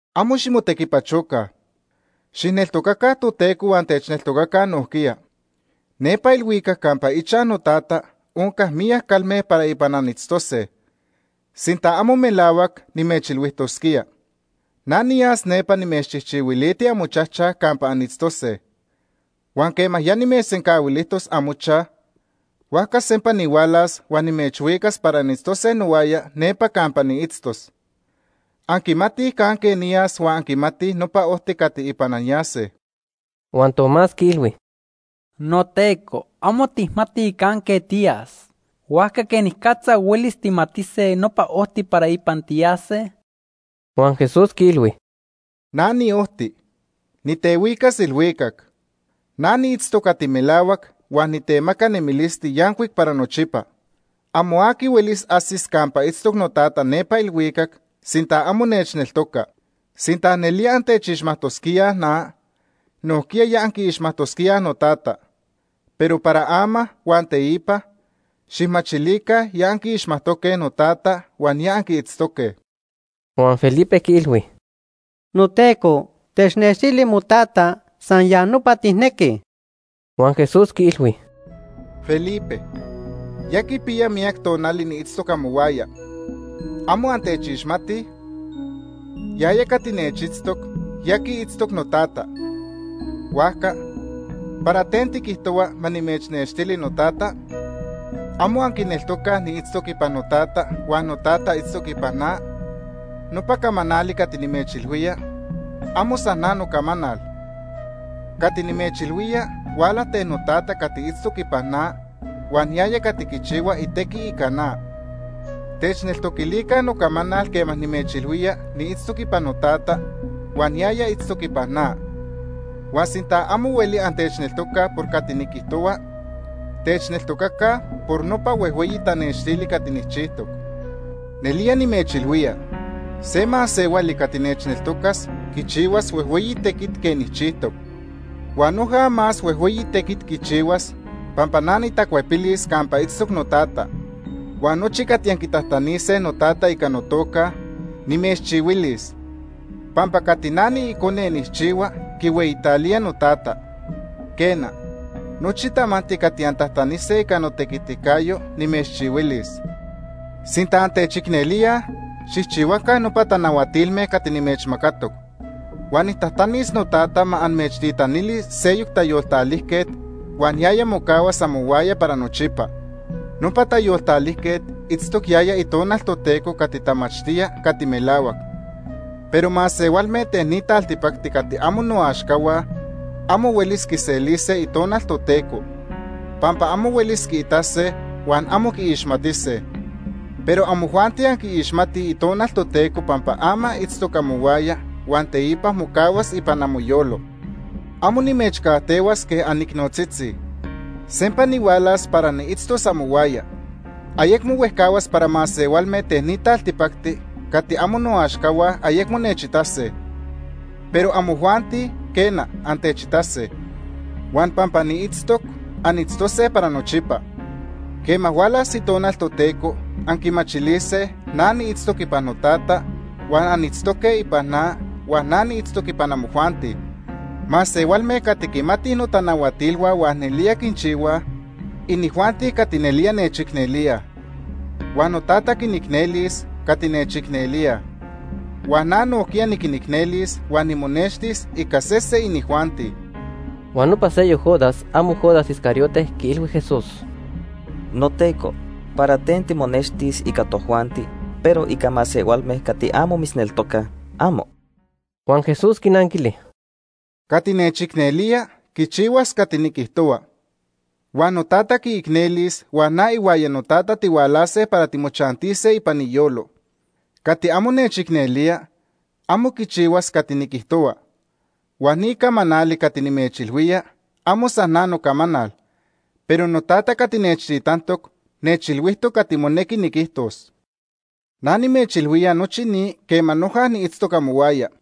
“Amo ximotequipachoca. Xijneltocaca Toteco huan techneltocaca nojquiya. Nepa ilhuicac campa ichaj noTata onca miyac calme para ipan anitztose. Sinta amo melahuac, nimechilhuijtosquía. Na niyas nepa nimechchijchihuiliti amochaj campa anitztose. Huan quema ya nimechsencahuilijtos amochaj, huajca sempa nihualas huan nimechhuicas para anitztose nohuaya nepa campa niitztos. Anquimatij canque niyas huan anquimatij nopa ojti cati ipan anyase.” Huan Tomás quiilhui: ―NoTeco, amo tijmatij canque tiyas, huajca ¿quenicatza huelis tijmatise nopa ojti para ipan tiyase? Huan Jesús quiilhui: ―Na niojti, nitehuicas ilhuicac. Na niitztoc cati melahuac huan nitemaca nemilisti yancuic para nochipa. Amo aqui huelis ajsis campa itztoc noTata nepa ilhuicac sinta amo nechneltoca. Sinta nelía antechixmajtosquíaj na, nojquiya ya anquiixmajtosquíaj noTata. Pero para ama huan teipa xijmachilica ya anquiixmajtoque noTata huan ya anquiitztoque. Huan Felipe quiilhui: ―NoTeco, technextili moTata, san ya nopa tijnequij. Huan Jesús quiilhui: ―Felipe, ya quipiya miyac tonali niitztoc amohuaya. ¿Amo antechixmatij? Yaya cati nechitztoc, ya quiitztoc noTata. Huajca, ¿para ten tiquijtohua ma nimechnextili noTata? ¿Amo anquineltocaj niitztoc ipan noTata huan noTata itztoc ipan na? Nopa camanali cati nimechilhuía, amo san na nocamanal. Cati nimechilhuía huala ten noTata cati itztoc ipan na, huan yaya cati quichihua itequi ica na. Techneltoquilica nocamanal quema nimechilhuía niitztoc ipan noTata huan yaya itztoc ipan na. Huan sinta amo hueli antechneltocaj por cati niquijtohua, techneltocaca por nopa huejhueyi tanextili cati nijchijtoc. Nelía nimechilhuía, se masehuali cati nechneltocas quichihuas huejhueyi tequit quej nijchijtoc. Huan noja más huejhueyi tequit quichihuas pampa na nitacuepilis campa itztoc noTata. Huan nochi cati anquitajtanise noTata ica notoca Ica notequiticayo., nimechchihuilis pampa cati na niIcone nijchihua quihueyitalía noTata. Quena, nochi tamanti cati antajtanise ica notequiticayo, nimechchihuilis. “Sinta antechicnelíaj, xijchihuaca nopa tanahuatilme cati nimechmacatoc. Huan nijtajtanis noTata ma amechtitanili seyoc Tayoltalijquet huan yaya mocahuas amohuaya para nochipa. Nopa Tayoltalijquet itztoc yaya Itonal Toteco cati tamachtía cati melahuac. Pero masehualme ten ni taltipacti cati amo noaxcahua amo huelis quiselise Itonal Toteco, pampa amo huelis quiitase huan amo quiixmatise. Pero amojuanti anquiixmatij Itonal Toteco pampa ama itztoc amohuaya huan teipa mocahuas ipan amoyolo. “Amo nimechcajtehuas quej anicnotzitzi. Sempa nihualas para niitztos amohuaya. Ayecmo huejcahuas para masehualme ten ni taltipacti cati amo noaxcahua ayecmo nechitase. Pero amojuanti, quena, antechitase. Huan pampa niitztoc, anitztose para nochipa. Quema hualas Itonal Toteco, anquimachilise na niitztoc ipan noTata, huan anitztoque ipan na huan na niitztoc ipan amojuanti. Masehualme cati quimatij notanahuatilhua huan nelía quinchihuaj, inijuanti cati nelía nechicnelíaj. Huan noTata quinicnelis cati nechicnelíaj, huan na nojquiya niquinicnelis huan nimonextis ica sese inijuanti.” Huan nopa seyoc Judas (amo Judas Iscariote) quiilhui Jesús: ―NoTeco, ¿para ten timonextis ica tojuanti, pero ica masehualme cati amo mitzneltocaj, amo? Huan Jesús quinanquili: ―Cati nechicnelía, quichihuas cati niquijtohua. Huan noTata quiicnelis huan na ihuaya noTata tihualase para timochantise ipan iyolo. Cati amo nechicnelía, amo quichihuas cati niquijtohua. Huan ni camanali cati nimechilhuía amo san na nocamanal, pero noTata cati nechtitantoc nechilhuijtoc cati monequi niquijtos. “Na nimechilhuía nochi ni quema noja niitztoc amohuaya.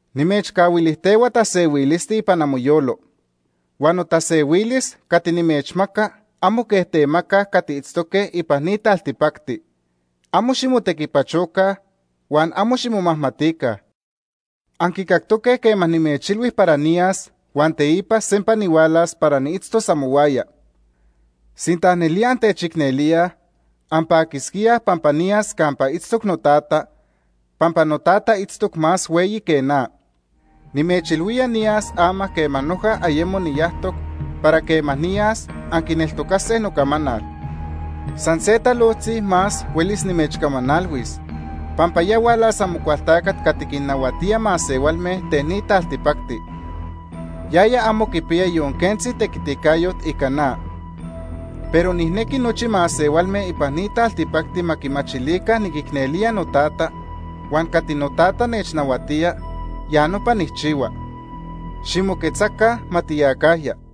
“Nimechcahuilijtehua tasehuilisti ipan amoyolo. Huan notasehuilis cati nimechmaca amo quej temacaj cati itztoque ipan ni taltipacti. Amo ximotequipachoca huan amo ximomajmatica. Anquicactoque quema nimechilhui para niyas huan teipa sempa nihualas para niitztos amohuaya. Sinta nelía antechicnelíaj, anpaquisquíaj pampa niyas campa itztoc noTata, pampa noTata itztoc más hueyi que na. Nimechilhuía niyas ama quema noja ayemo niyajtoc para quema niyas, anquineltocase nocamanal. “San se talojtzi más huelis nimechcamanalhuis pampa ya hualas Amocualtacat cati quinnahuatía masehualme ten ni taltipacti. Yaya amo quipiya yon quentzi tequiticayot ica na. Pero nijnequi nochi masehualme ipan ni taltipacti ma quimachilica niquicnelía noTata, huan cati noTata nechnahuatía, ya nopa nijchihua. Ximoquetzaca, ma tiyacajya.